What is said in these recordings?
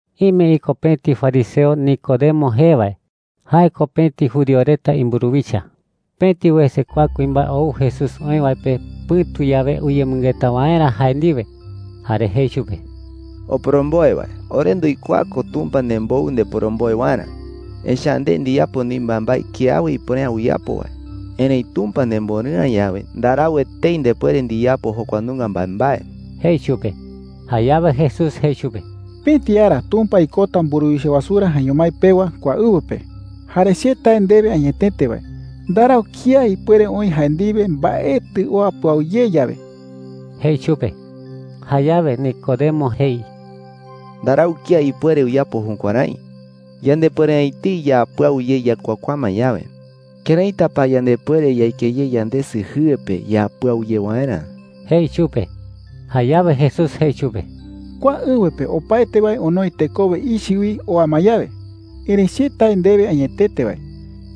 Ime iko pëti fariseo Nicodemo jee wae. Jae ko pëti judío reta imburuwicha. Pëti wese kua kuimbae ou Jesús oï wae pe pɨ̈tu yawe uyemɨngeta waerä jae ndiwe. Jare jei chupe: “Oporomboe wae, ore nduikuaa ko Tumpa nembou ndeporomboe waerä. Echa’ä nde ndiyapo neï mbaembae kiawe ipuere’ä uyapo wae. Erëi Tumpa nemborɨ'ä yawe, ndarau etei ndepuere ndiyapo jokua nunga mbaembae,” jei chupe. Jayawe Jesús jei chupe: “Pëti ara Tumpa ikota mburuwicha wasurä jaeño mái pewa kua ɨwɨ pe. Jare che tae ndewe añetete wae, ndarau kía ipuere oï jae ndiwe mbaetɨ oa pɨau ye yawe,” jei chupe. Jayawe Nicodemo jei: “Ndarau kía ipuere uyapo jukuärái. Yandepuere’ä etei yaa pɨau ye yakuakuaa ma yawe. ¿Këraita pa yandepuere yaike ye yandesɨ jɨe pe yaa pɨau ye waerä?” jei chupe. Jayawe Jesús jei chupe: “Kua ɨwɨ pe opaete wae onoi tekowe ichɨ wi oa ma yawe. Erëi che tae ndewe añetete wae,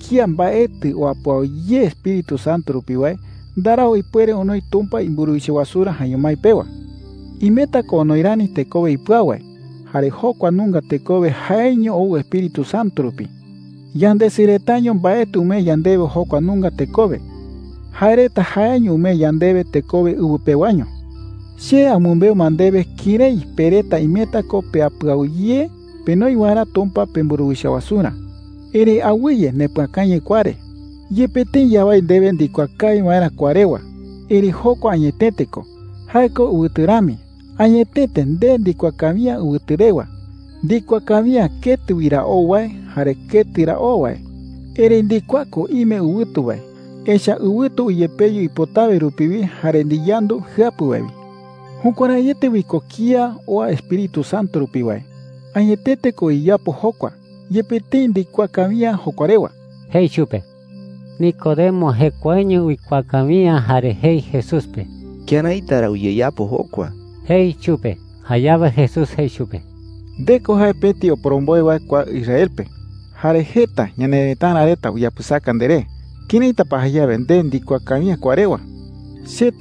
kía mbaetɨ oa pɨau ye Espíritu Santo rupi wae, ndarau ipuere onoi Tumpa imburuwicha wasurä jaeño mái pewa. Imeta ko onoi rani tekowe ipɨau wae, jare jokua nunga tekowe jaeño ou Espíritu Santo rupi. Yandesɨ retaño mbaetɨ umee yandewe jokua nunga tekowe. Jae reta jaeño umee yandewe tekowe ɨwɨ pewaño,” jei chupe. “Che amɨmbeu ma ndewe kërái pe reta imeta ko pea pɨau ye penoi waerä Tumpa pemburuwicha wasurä. Erëi awɨye ndepɨakañɨ kua re,” jei chupe. “Yepe tëi yawái ndewe ndikuaa kawi waerä kua rewa, erëi jokua añetete ko. Jae ko ɨwɨtu rami. Añetete nde ndikuaa kawi’ä ɨwɨtu rewa. Ndikuaa kawi’ä ketɨ wi ra ou wae jare ketɨ ra oo wae. Erëi ndikuaa ko ime ɨwɨtu wae, echa’ä ɨwɨtu uyepeyu ipotawe rupi wi jare ndiyandu jɨapu wae wi,” jei chupe. “Jukuäraiete wi ko kía oa Espíritu Santo rupi wae. Añetete ko uyeyapo jokua, yepe tëi ndikuaa kawi’ä jokua rewa,” jei chupe. Nicodemo jekuaeño uikuaa kawi’ä jare jei Jesús pe: “¿Këraita ra uyeyapo jokua?” jei chupe. Jayawe Jesús jei chupe: “Nde ko jae pëti oporomboe wae kua Israel pe, jare jeta ñanerëtara reta uyapɨsaka nderé. ¿Këraita pa jayawe nde ndikuaa kawi’ä kua rewa?” jei.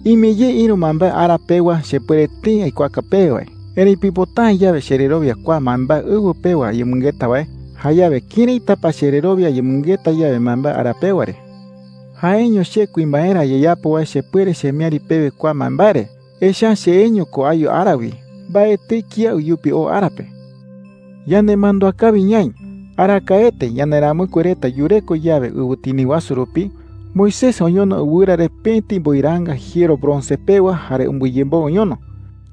“Ime ye ïru mbaembae ara pewa chepuere tëi aikuaaka pewe wae. Erëi pipota’ä yawe chererowia kua mbaembae ɨwɨ pewa ayemɨngeta wae, jayawe ¿këraita pa chererowia ayemɨngeta yawe mbaembae ara pewa re? Jaeño che kuimbaerä ayeyapo wae chepuere chemiäri pewe kua mbaembae re, echa’ä cheeño ko ayu ara wi. Mbaetɨi kía uyupi oo ara pe,” jei chupe. “Yanemandúa kawi ñaï: Arakaete yanderamɨkue reta yureko yawe ɨwɨtini wasu rupi, Moisés oñono ɨwɨra re pëti mboiraanga jiero bronce pewa jare umbɨyemboɨ oñono.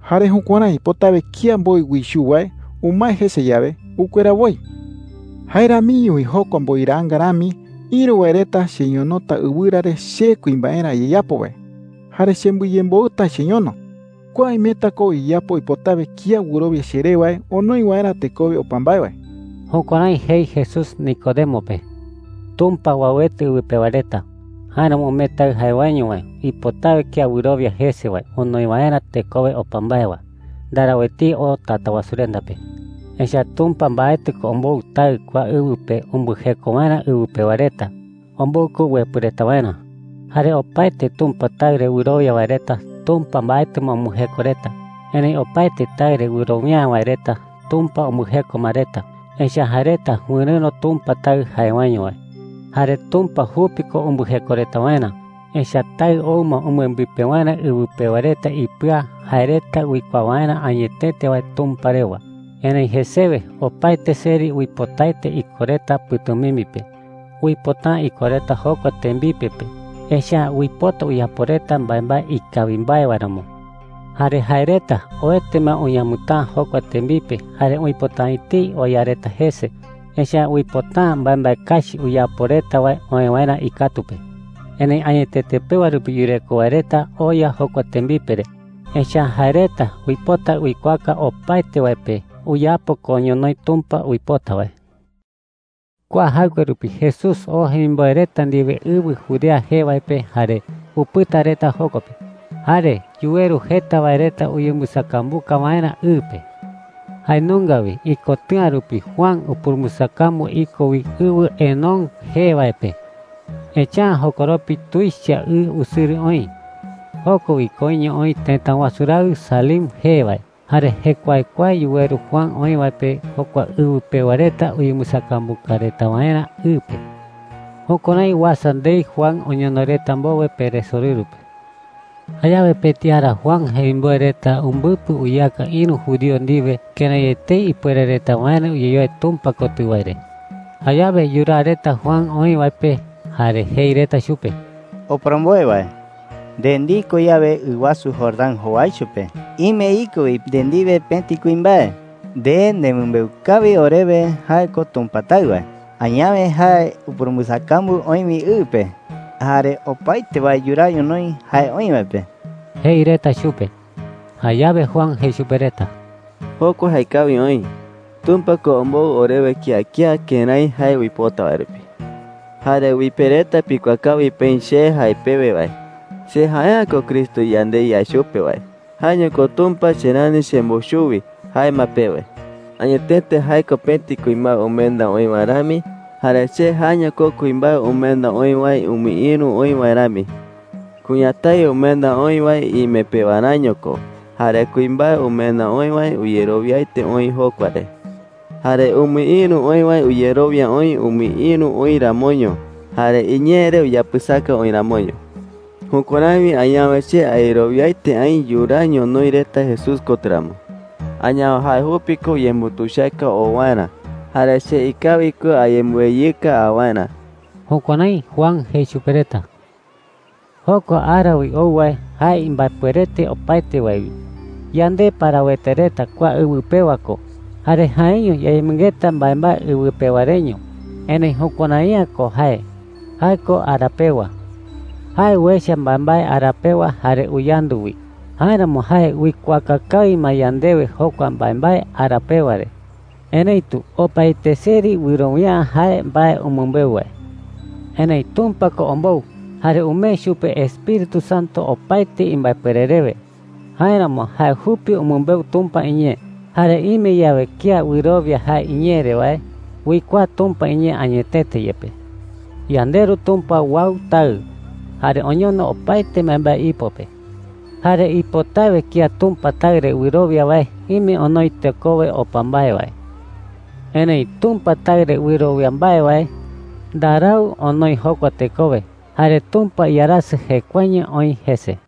Jare jukuärái ipotawe kía mboi uichuu wae umae jese yawe, ukuera woi,” jei chupe. “Jae ramiño wi jokua mboiraanga rami, ïru wae reta cheñonota ɨwɨra re che kuimbaerä ayeyapo wae, jare chembɨyemboɨta cheñono. Kua imeta ko uyeyapo ipotawe kía wɨrowia cheré wae onoi waerä tekowe opa mbae wae.” Jukuärái jei Jesús Nicodemo pe. Tumpa uauete ɨwɨ pewa reta. Jáeramo umee Taɨ jae waeño wae, ipotawe kía wɨrowia jese wae onoi waerä tekowe opa mbae wae. Ndarau etei oo Tatawasurenda pe. Echa’ä Tumpa mbaetɨ ko ombou Taɨ kua ɨwɨ pe umbɨjeko waerä ɨwɨ pewa reta. Ombou ko uepɨ reta waerä. Jare opaete Tumpa Taɨ re wɨrowia wae reta, Tumpa mbaetɨ ma umbɨjeko reta. Erëi opaete Taɨ re wɨrowia’ä wae reta, Tumpa umbɨjeko ma reta, echa’ä jae reta wɨrɨ̈ro Tumpa Taɨ jae waeño wae. Jare Tumpa jupi ko umbɨjeko reta waerä. Echa’ä Taɨ ou ma umbɨembipe waerä ɨwɨ pewa reta ipɨa jae reta uikuaa waerä añetete wae Tumpa rewa. Erëi jesewe opaete seri uipotaete iko reta pɨ̈tumimbi pe. Uipota’ä iko reta jokua tembipe pe, echa’ä uipota uyapo reta mbaembae ikawi mbae wae ramo. Jare jae reta oete ma uñamɨtäa jokua tembipe jare uipota’ä etei oya reta jese, echa’ä uipota’ä mbaembae kachi uyapo reta wae oë waerä ikatu pe. Erëi añetete pewa rupi yureko wae reta oya jokua tembipe re, echa’ä jae reta uipota uikuaaka opaete wae pe uyapo ko ñonoï Tumpa uipota wae. Kua jaɨkue rupi Jesús oo jemimboe reta ndiwe ɨwɨ Judea jee wae pe jare upɨta reta joko pe. Jare yuweru jeta wae reta uyembɨsakambuka waerä ɨ pe. Jae nunga wi ikotɨ̈a rupi Juan upurumbɨsakambu iko wi ɨwɨ Enón jee wae pe, echa’ä jokoropi tuicha ɨ usɨrɨ oï. Joko wi koiño oï tëta wasu raɨ Salim jee wae. Jare jekuaekuae yuweru Juan oï wae pe jokua ɨwɨ pewa reta uyembɨsakambuka reta waerä ɨ pe. Jukuärái uasa ndei Juan oñono reta mbowe peresorɨru pe. Jayawe pëti ara Juan jemimboe reta umbɨpɨ uyeaka ïru judío ndiwe kërái etei ipuere reta waerä uyeyoe Tumpa kotɨ wae re. Jayawe yuraa reta Juan oï wae pe jare jei reta chupe: “Oporomboe wae, nde ndiko yawe ɨ wasu Jordán jowaicho pe, ime iko wi nde ndiwe pëti kuimbae. Nde nemɨmbeu kawi orewe jae ko Tumpa Taɨ wae. Añawe jae upurumbɨsakambu oï wi ɨ pe, jare opaete wae yuraa ñonoï jae oï wae pe,” jei reta chupe. Jayawe Juan jei chupe reta: “Jokua jaekawi oï. Tumpa ko ombou orewe kía kía kërái jae uipota wae rupi,” jei. “Jare wi pe reta pikuaa kawi peï che jae pewe wae, ‘Che jae’ä ko Cristo yande yae chupe wae. Jaeño ko Tumpa che rani chembou chuwi,’ jae ma pewe. Añetete jae ko pëti kuimbae umenda oï wae rami, jare che jaeño ko kuimbae umenda oï wae umɨïru oï wae rami,” jei. “Kuñatái umenda oï wae ime pewaräño ko. Jare kuimbae umenda oï wae uyerowiaete oï jokua re. Jare umɨïru oï wae uyerowia oï umɨïru oï ramoño jare iñee re uyapɨsaka oï ramoño,” jei. “Jukuärái wi añawe che ayerowiaete aï yuraa ñonoï reta Jesús kotɨ ramo. Añawe jae jupi ko uyembutuichaka oo waerä, jare che ikawi ko ayembɨweyɨka a waerä.” Jukuärái Juan jei chupe reta. Jokua ara wi ou wae, jae imbaepuerete opaete wae wi. Yande parawete reta kua ɨwɨ pewa ko jare jaeño yayemɨngeta mbaembae ɨwɨ pewa reño. Erëi jukuärai’ä ko jae. Jae ko ara pewa. Jae uecha mbaembae ara pewa jare uyandu wi. Jáeramo jae uikuaaka kawi ma yandewe jokua mbaembae ara pewa re. Erëitu opaete seri wɨrowia’ä jae mbae umɨmbeu wae. Erëi Tumpa ko ombou jare umee chupe Espíritu Santo opaete imbaepuere rewe. Jáeramo jae jupi umɨmbeu Tumpa iñee. Jare ime yawe kía wɨrowia jae iñee re wae, uikuaa Tumpa iñee añetete yepe. YandeRu Tumpa uau Taɨ jare oñono opaete mbaembae ipo pe. Jare ipotawe kía Tumpa Taɨ re wɨrowia wae ime onoi tekowe opa mbae wae. Erëi Tumpa Taɨ re wɨrowia mbae wae ndarau onoi jokua tekowe, jare Tumpa iarasɨ jekuaeño oï jese.